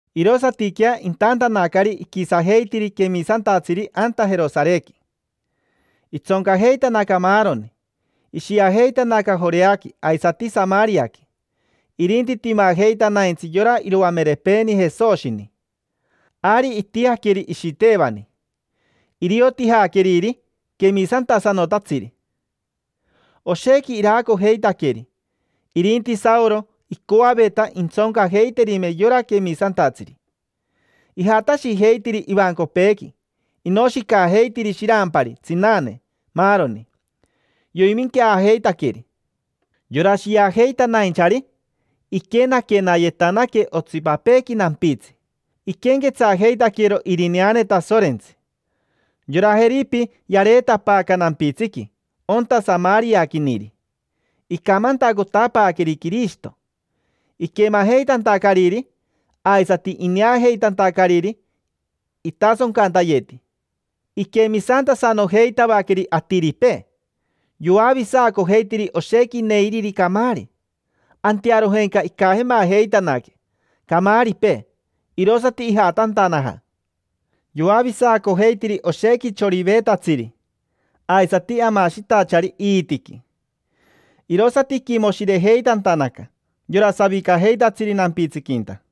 Irosatiquea intantanacari iquisajeitiri quemisantatsiri anta Jerosarequi. Itsoncajeitanaca maaroni, ishiajeitanaca Joreaqui, aisati Samariaqui. Irinti timajeitanaintsi yora iroamerepeeni Jesoshini. Ari itijaqueri Ishitevani. Irio tijaqueriri quemisantasanotatsiri. Oshequi iraacojeitaqueri. Irinti Saoro, icoaveta intsoncajeiterime yora quemisantatsiri. Ijatashijeitiri ivancopeequi, inoshicajeitiri shirampari, tsinane, maaroni. Yoiminqueajeitaqueri. Yora shiajeitanainchari, iquenaquenayetanaque otsipapeequi nampitsi. Iquenquetsajeitaquero irineane Tasorentsi. Yora Jeripi yareetapaaca nampitsiqui, onta Samariaquiniri. Icamantacotapaaqueri Quirishito. Iquemajeitantacariri, aisati ineajeitantacariri itasoncantayeti, iquemisantasanojeitavaqueri atiripee. Yoavisacojeitiri oshequi neiriri camaari, antearojenca icajemajeitanaque camaaripee, irosati ijatantanaja. Yoavisacojeitiri oshequi choriveetatsiri, aisati amashitachari iitiqui. Irosati iquimoshirejeitantanaca yora savicajeitatsiri nampitsiquinta.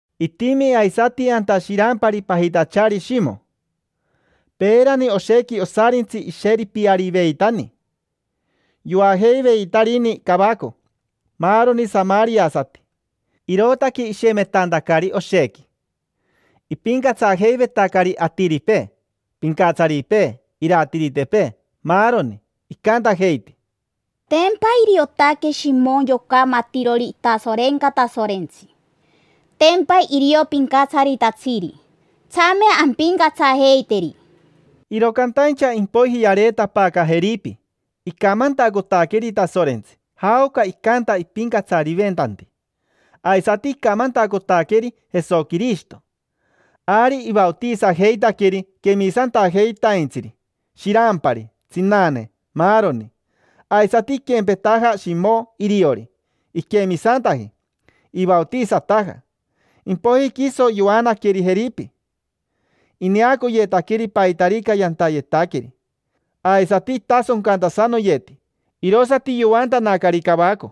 Itimi aisati anta shirampari pajitachari Shimo. Peerani oshequi osarintsi isheripiariveitani. Yoajeivetarini cavaco maaroni samariasati, irootaque ishemetantacari oshequi. Ipincatsajeivetacari atiripee: pincatsaripee, iratiritepee, maaroni. Icantajeiti: —Tempa iriotaque Shimo yoca matirori itasorenca Tasorentsi. Tempa irio pincatsaritatsiri. Tsame ampincatsajeiteri. Iro cantaincha impoiji yareetapaaca Jeripi, icamantacotaqueri Tasorentsi, jaoca icanta ipincatsariventanti. Aisati icamantacotaqueri Jesoquirishito. Ari ivaotisajeitaqueri quemisantajeitaintsiri: shirampari, tsinane, maaroni. Aisati iquempetaja Shimo iriori, iquemisantaji, ivaotisataja. Impoiji quiso yoanaqueri Jeripi. Ineacoyetaqueri paitarica yantayetaqueri, aisati itasoncantasanoyeti. Irosati yoantanacari cavaco.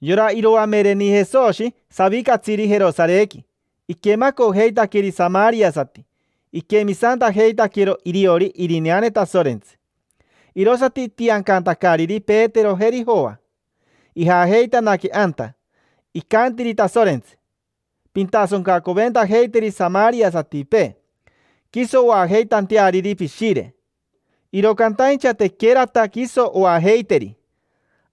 Yora iroamereni Jesoshi savicatsiri Jerosarequi iquemacojeitaqueri samariasati, iquemisantajeitaquero iriori irineane Tasorentsi, irosati itiancantacariri Petero, jeri Joa. Ijajeitanaque anta. Icantiri Tasorentsi: “Pintasoncacoventajeiteri samariasatipee, quiso oajeitanteariri Pishire”. Iro cantaincha tequerata quiso oajeiteri,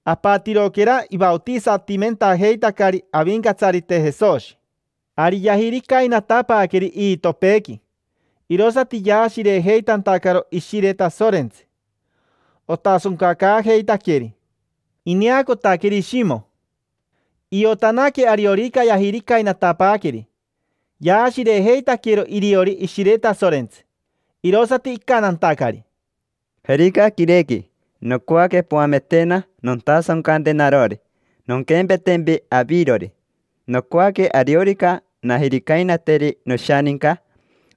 apatiroquera ivaotisatimentajeitacari Avincatsarite Jesoshi. Ari yajiricainatapaaqueri iitopeequi, irosati yaashirejeitantacaro Ishire Tasorentsi, otasoncacaajeitaqueri. Ineacotaqueri Shimo. Iotanaque ariorica yajiricainatapaaqueri, yaashirejeitaquero iriori Ishire Tasorentsi, irosati icantantacari: —Jerica quirequi, nocoaque poametena nontasoncante narori, nonquempetempi avirori. Nocoaque ariorica najiricainateri noshaninca,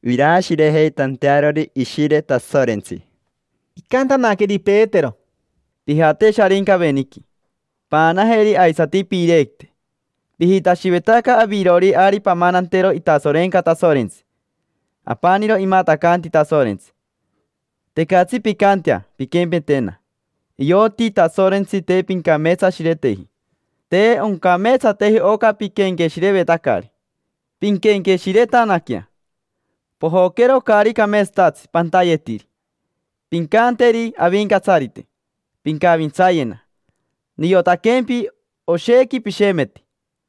iraashirejeitantearori Ishire Tasorentsi. Icantanaqueri Petero: —Pijate Sharincaveniqui, paanajeri aisati piirequite. Pijitashivetaca avirori ari pamanantero itasorenca Tasorentsi: apaniro imatacanti Tasorentsi. Tecatsi pincantea pinquempetena: ioti Tasorentsi te pincameetsashireteji. Te oncameetsateji oca piquenqueshirevetacari. Pinquenqueshiretanaquea, pojoquero caari cameetsatatsi pantayetiri. Pincanteri Avincatsarite: “Pincavintsayena”. Niotaquempi, oshequi pishemeti,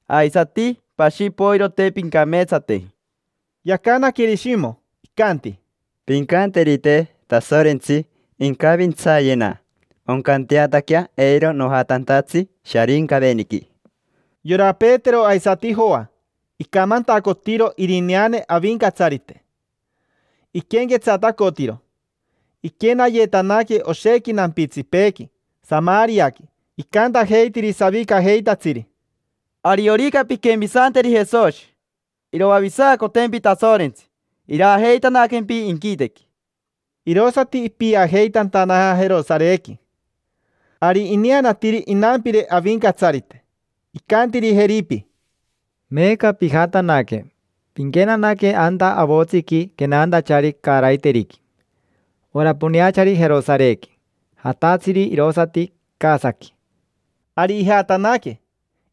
aisati pashi poiro te pincameetsateji. Yacanaqueri Shimo, icanti: —Pincanterite Tasorentsi incavintsayena oncanteataquea eiro nojatantatsi Sharincaveniqui. Yora Petero aisati Joa, icamantacotiro irineane Avincatsarite, iquenquetsatacotiro. Iquenayetanaque oshequi nampitsipeequi Samariaqui, icantajeitiri savicajeitatsiri: —Ariorica pinquemisanteri Jesoshi, iroavisacotempi Tasorentsi, iraajeitanaquempi inquitequi. Irosati ipiajeitantanaja Jerosarequi. Ari ineanatiri inampire Avincatsarite, icantiri Jeripi: —Meeca pijatanaque, pinquenanaque anta avotsiqui quenantachari caaraiteriqui: ora poneachari Jerosarequi, jatatsiri irosati Casaqui. Ari ijatanaque,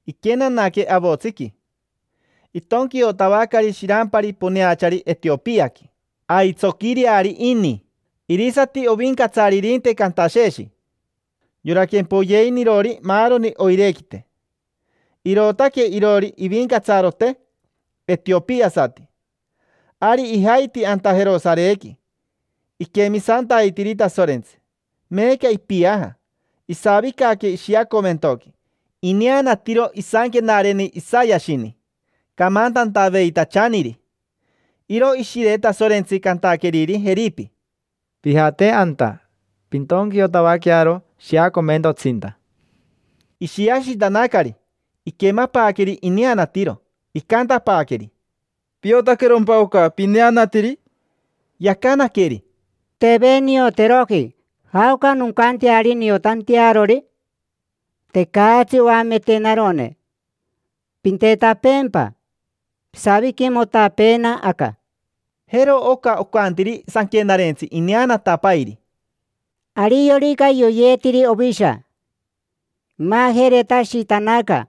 iquenanaque avotsiqui. Itonquiotavacari shirampari poneachari Etiopiaqui. Aitsoquireari ini. Irisati ovincatsaririnte Cantasheshi, yora quempoyeinirori maaroni oirequite. Irootaque iroori ivincatsarote etiopiasati. Ari ijaiti anta Jerosarequi, iquemisantaitiri Tasorentsi. Meeca ipiaja, isavicaque ishiacomentoqui, ineanatiro isanquenareni Isayashini, camantantaveitachaniri. Iro Ishire Tasorentsi cantaqueriri Jeripi: —Pijate anta, pintonquiotavaquearo shiacomentotsinta. Ishiashitanacari, iquemapaaqueri ineanatiro. Icantapaaqueri: —¿Piotaquerompa oca pineanatiri? Yacanaqueri: —Teve nioteroji. ¿Jaoca noncanteari niotantearori? Tecatsi oametenarone. Pintetapeempa, pisaviquimotapeena aca. Jero oca ocantiri sanquenarentsi ineanatapairi: “Ariorica yoyeetiri ovisha, imajeretashitanaca.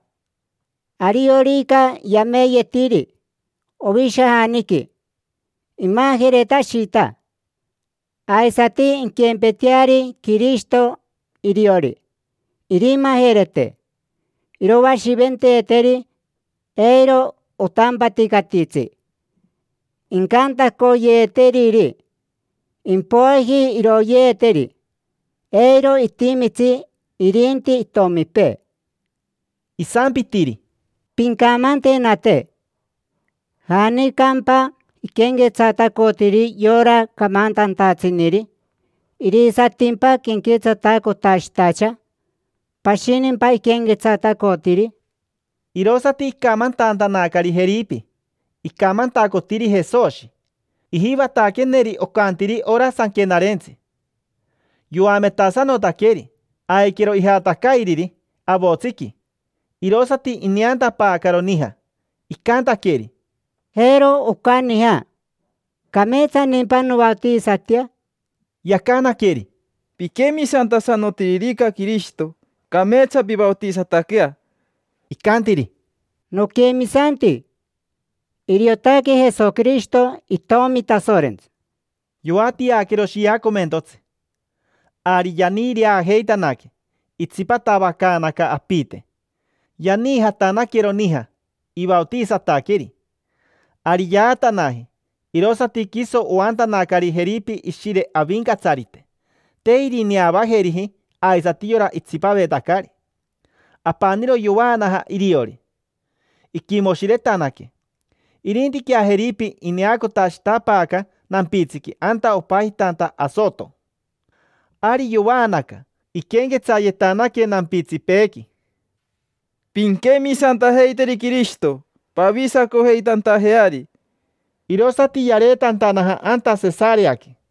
Ariorica yameeyeetiri ovishajaniqui, imajeretashita. Aisati inquempeteari Quirishito iriori, irimajerete. Iroashiventeeteri, eiro otampaticatitsi incantacoyeeteriri. Impoiji iroyeeteri. Eiro itimitsi irinti itomipee”. Isampitiri: —Pincamantenate. ¿Janicampa iquenquetsatacotiri yora camantantatsiniri? ¿Irisatimpa quenquetsatacotashitacha? ¿Pashinimpa iquenquetsatacotiri? Irosati icamantantanacari Jeripi, icamantacotiri Jesoshi. Ijivataqueneri ocantiri ora Sanquenarentsi, yoametasanotaqueri. Aiquero ijatacairiri avotsiqui, irosati ineantapaacaro nija. Icantaqueri: —Jero oca nija. ¿Cameetsanimpa novaotisatea? Yacanaqueri: —Piquemisantasanotiririca Quirishito, cameetsa pivaotisataquea. Icantiri: —Noquemisanti. Iriotaque Jesoquirishito Itomi Tasorentsi. Yoatiaquero shiacomentotsi. Ari yaniireajeitanaque, itsipatavacaanaca apite, yaniijatanaquero nija, ivaotisataqueri. Ari yaatanaji, irosati quiso oantanacari Jeripi Ishire Avincatsarite. Te irineavajeriji aisati yora itsipavetacari. Apaniro yovaanaja iriori, iquimoshiretanaque. Irintiquea Jeripi ineacotashitapaaca nampitsiqui anta opajitanta Asoto. Ari yovaanaca, iquenquetsayetanaque nampitsipeequi: —Pinquemisantajeiteri Quirishito pavisacojeitantajeari. Irosati yareetantanaja anta Sesareaqui.